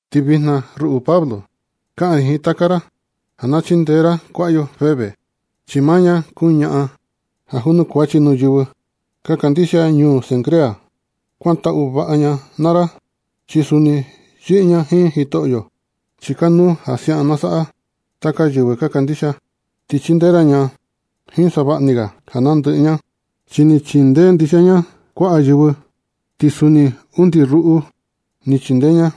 Ti vijna, ruꞌu Pablo, kaꞌan ri jiin taka ra ja na chindee ra kuaꞌa yo Febe, chi maa ña kuu ñaꞌan ja junukuachi nuu yɨvɨ ka kandixia ñuu Cencrea. Kuantaꞌu vaꞌa ña naa ra, chi suni yɨꞌɨ ña jiin Jitoꞌyo, chi kanuu ja siaꞌan na saꞌa taka yɨvɨ ka kandixia. Ti chindee ra ña jiin savaꞌa ni ga ja nandɨꞌɨ ña, chi ni chindee ndixia ña kuaꞌa yɨvɨ, ti suni undi ruꞌu ni chindee ña.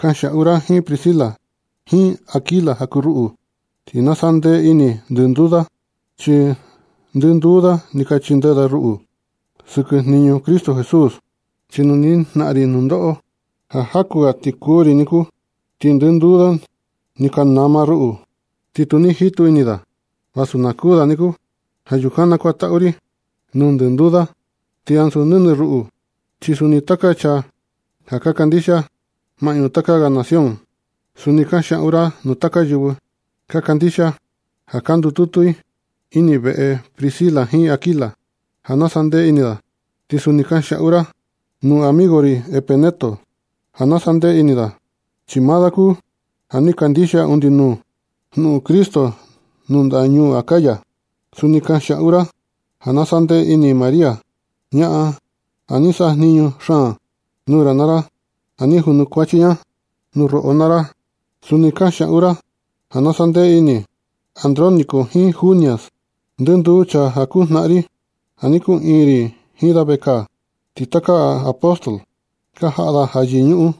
Kanxiaꞌu ra jiin Priscila jiin Aquila ja kuu ruꞌu ti na sa ndee ini ndɨnduu da, chi ndɨnduu da ni ka chindee ruꞌu sɨkɨ jniñu Cristo Jesús. Chi nu ni jnaꞌan ri nundoꞌo ja jaku ni ga ti kuū ri niku, ti ndɨnduu da ni ka nama ruꞌu, ti tu ni jitu ini da vasu na kuū da niku. Ja yukan nakuantaꞌu ri nuu ndɨnduu da, ti ansu nɨnɨ ruꞌu, chi suni taka chaa ja ka kandixia maꞌñu taka ga nación. Suni kanxiaꞌu ra nuu taka yɨvɨ ka kandixia ja ka ndututu i ini veꞌe Priscila jiin Aquila ja na sandee ini da. Suni kanxiaꞌu ra nuu amigo ri Epeneto ja na sandee ini da. Chi maa da kuu ja ni kandixia undi nuu jnuꞌun Cristo nuu ndaꞌa ñuu Acaya. Suni kanxiaꞌu ra ja na sandee ini María, ñaꞌan ja ni sajniñu xaan nuu ra naa ra ja ni junukuachi ña nuu roꞌo naa ra. Suni kanxiaꞌu ra ja na sandee ini Andrónico jiin Junias, ndɨnduu chaa ja kuu jnaꞌan ri, ja ni kuꞌiin ri jiin da vekaa. Ti taka apóstol ka jaꞌa da yɨñuꞌun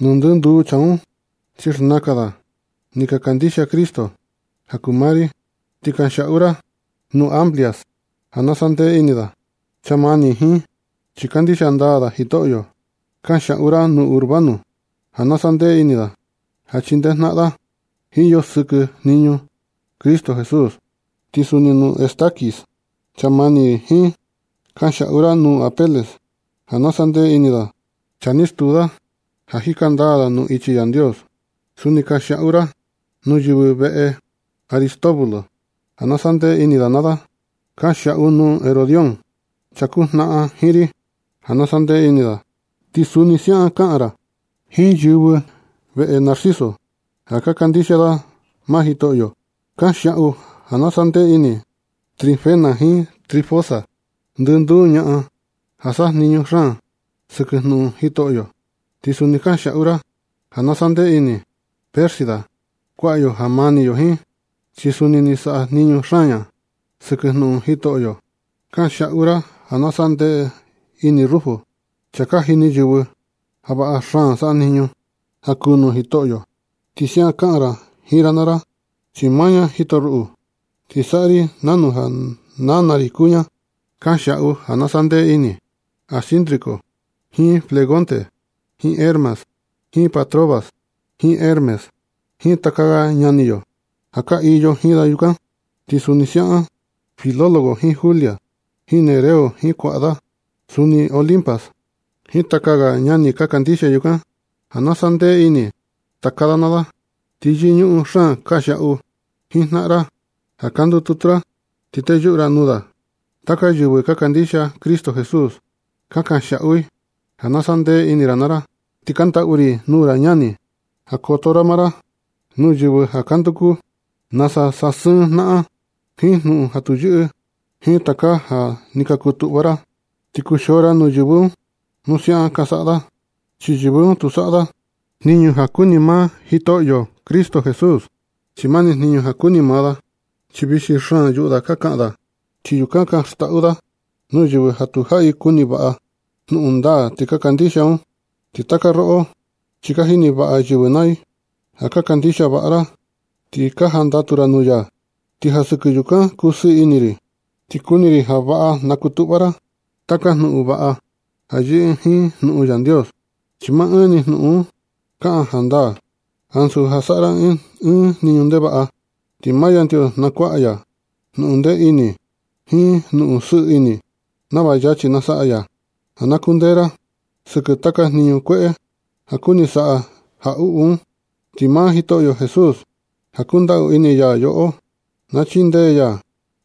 nuu ndɨnduu chaa un, chi xnakan da ni ka kandixia Cristo ja kuu maa ri. Ti kanxiaꞌu ra nuu Amplias ja na sandee ini da, chaa mani ri jiin, chi kandixia ndaa da Jitoꞌyo. Kanxiaꞌu ra nuu Urbano ja na sandee ini da, ja chindee jnaꞌan da jiin yo sɨkɨ jniñu Cristo Jesús. Ti suni nuu Estaquis, chaa mani ri jiin. Kanxiaꞌu ra nu Apeles ja na sandee ini da, chaa ja ni stuu da ja jika ndaa da nuu ichi Yandios. Suni kanxiaꞌu ra nuu yɨvɨ veꞌe Aristóbulo, ja na sandee ini da naa da. Kanxiaꞌu nuu Herodión, chaa kuu jnaꞌan jiin ri ja na sandee ini da. Ti suni siaꞌa kaꞌan ra jiin yɨvɨ veꞌe Narciso, ja ka kandixia i maa Jitoꞌyo. Kanxiaꞌu ja na sandee ini Trifena jiin Trifosa, ndɨnduu ñaꞌan ja sajniñu xaan sɨkɨ jnuꞌun Jitoꞌyo. Ti suni kanxiaꞌu ra ja na sandee ini Pérsida, kuaꞌa yo ja mani yo jiin, chi suni ni sajniñu xaan ña sɨkɨ jnuꞌun Jitoꞌyo. Kanxiaꞌu ra ja na sandee xaan ini Rufo, chaa ka jini yɨvɨ ja vaꞌa xaan sajniñu ja kuu nuu Jitoꞌyo. Ti suni siaꞌan kaꞌan ra jiin nana da, chi maa ña ni jito ruꞌu, ti saꞌa ri nanu ja nana ri kuu ña. Kanxiaꞌu ja na sandee ini Asíncrito jiin Flegonte jiin Hermas jiin Patrobas jiin Hermes jiin taka ga ñani yo ja ka iyo jiin da yukan. Ti suni siaꞌan Filólogo jiin Julia jiin Nereo jiin kuaꞌa da, suni Olimpas, jiin taka ga ñani ka kandixia yukan, ja na sandee ini taka da naa da. Ti yɨñuꞌun xaan kanxiaꞌu jiin jnaꞌan ra ja ka ndututu ra, ti teyuꞌu ra nuu da. Taka yɨvɨ ka kandixia Cristo Jesús ka kanxiaꞌu i ja na sandee ini ra naa ra. Ti kaꞌan ndaꞌu ri nuu ra ñani, ja koto ra maa ra nuu yɨvɨ ja ka nduku nasa sasɨɨn jnaꞌan jiin jnuꞌun ja tu yɨꞌɨ jiin taka ja ni ka kutuꞌva ra. Ti kuxio ra nuu yɨvɨ un nu siaꞌan ka saꞌa da, chi yɨvɨ un tu saꞌa da jniñu ja kuni maa Jitoꞌyo Cristo Jesús, chi maa ni jniñu ja kuni maa da. Chi vixi xaan yuꞌu da ka kaꞌan da, ti yukan ka xndaꞌu da nuu yɨvɨ ja tu jaꞌi kuni vaꞌa da jnuꞌun ndaa ti ka kandixia da un. Ti taka roꞌo, chi ka jini vaꞌa yɨvɨ naa i ja ka kandixia vaꞌa ra ti ka jandatu ra nuu ya, ti ja sɨkɨ yukan kusɨɨ ini ri. Ti kuni ri ja vaꞌa na kutuꞌva ra taka jnuꞌun vaꞌa ja yɨꞌɨ jiin jnuꞌun Yandios, chi maa ɨɨn ni jnuꞌun un kaꞌan jandaa, ansu ja saꞌa ra ɨɨn jniñu ndevaꞌa. Ti maa Yandios na kuaꞌa ya jnuꞌun ndee ini jiin jnuꞌun sɨɨ ini, nava yachi na saꞌa ya ja na kundee ra sɨkɨ taka jniñu kueꞌe ja kuni saꞌa jaꞌuꞌu un. Ti maa Jitoꞌyo Jesús ja kundaꞌu ini ya yoꞌo, na chindee ya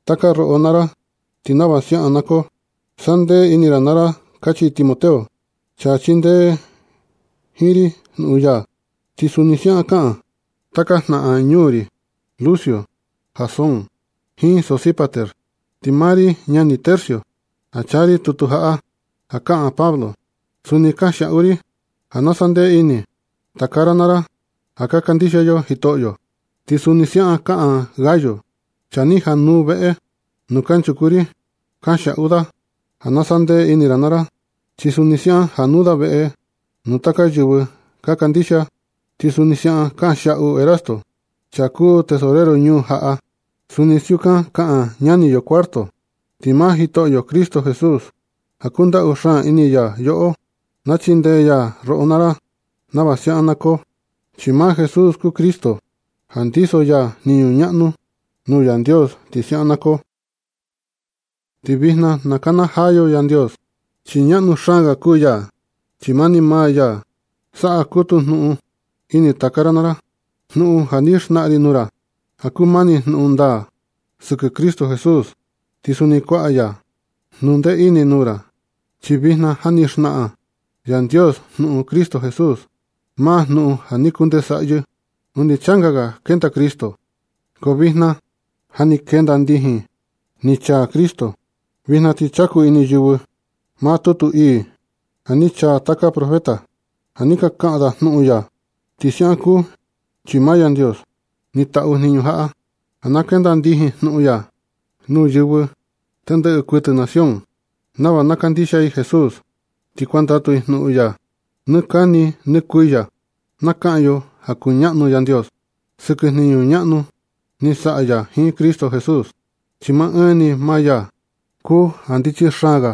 taka roꞌo naa ra, ti nava siaꞌan na koo. Sandee ini ra naa ra kachi Timoteo, chaa chindee jiin ri sɨkɨ jnuꞌun ya. Ti suni siaꞌan kaꞌan taka jnaꞌan ñuu ri, Lucio, Jasón jiin Sosípater. Ti maa ri ñani Tercio, ja chaa ri tutu jaꞌa ja kaꞌan Pablo, suni kanxiaꞌu ri ja na sandee ini taka ra naa ra ja ka kandixia yo Jitoꞌyo. Ti suni siaꞌan kaꞌan Gayo, chaa ni jaꞌa nuu veꞌe nuu kanchuku ri. Kanxiaꞌu da ja na sandee ini ra naa ra. Chi suni siaꞌan januu da veꞌe nuu taka yɨvɨ ka kandixia. Ti suni siukan kanxiaꞌu Erasto, chaa kuu tesorero ñuu jaꞌa. Suni siukan kaꞌan ñani yo Cuarto. Ti maa Jitoꞌyo Cristo Jesús ja kundaꞌu xaan ini ya yoꞌo, na chindee ya roꞌo naa ra nava siaꞌan na koo, chi maa Jesús kuu Cristo ja ndiso ya jniñu ñaꞌnu nuu Yandios. Ti siaꞌan na koo. Ti vijna na kana yo Yandios chi ñaꞌnu xaan ga kuu ya. Chi mani maa ya saꞌa kutu jnuꞌun ini taka ra naa ra, jnuꞌun ja ni xnaꞌan ri nuu ra ja kuu mani jnuꞌun ndaa sɨkɨ Cristo Jesús. Ti suni kuaꞌa ya jnundee ini nuu ra, chi vijna ja ni xnaꞌan Yandios jnuꞌun Cristo Jesús, maa jnuꞌun ja ni kunde saꞌyɨ undi changa ga ni ndenda Cristo. Ko vijna ti ja ni kenda ndijin chi ni chaa Cristo. Vijna ti chaku ini yɨvɨ maa tutu ii ja ni chaa taka profeta, ja ni ka kaꞌan da jnuꞌun ya. Ti siaꞌan kuu chi maa Yandios ni taꞌu jniñu jaꞌa, ja na kenda ndijin jnuꞌun ya nuu yɨvɨ tendɨꞌɨ kuɨtɨ nación, nava na kandixia i Jesús ti kuandatu i jnuꞌun ya. Nɨ kani nɨ kuiya na kaꞌan yo ja kuñaꞌnu Yandios sɨkɨ jniñu ñaꞌnu ni saꞌa ya jiin Cristo Jesús. Chi maa ɨɨn ni maa ya kuu ja ndichi xaan ga.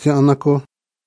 Siaꞌan na koo.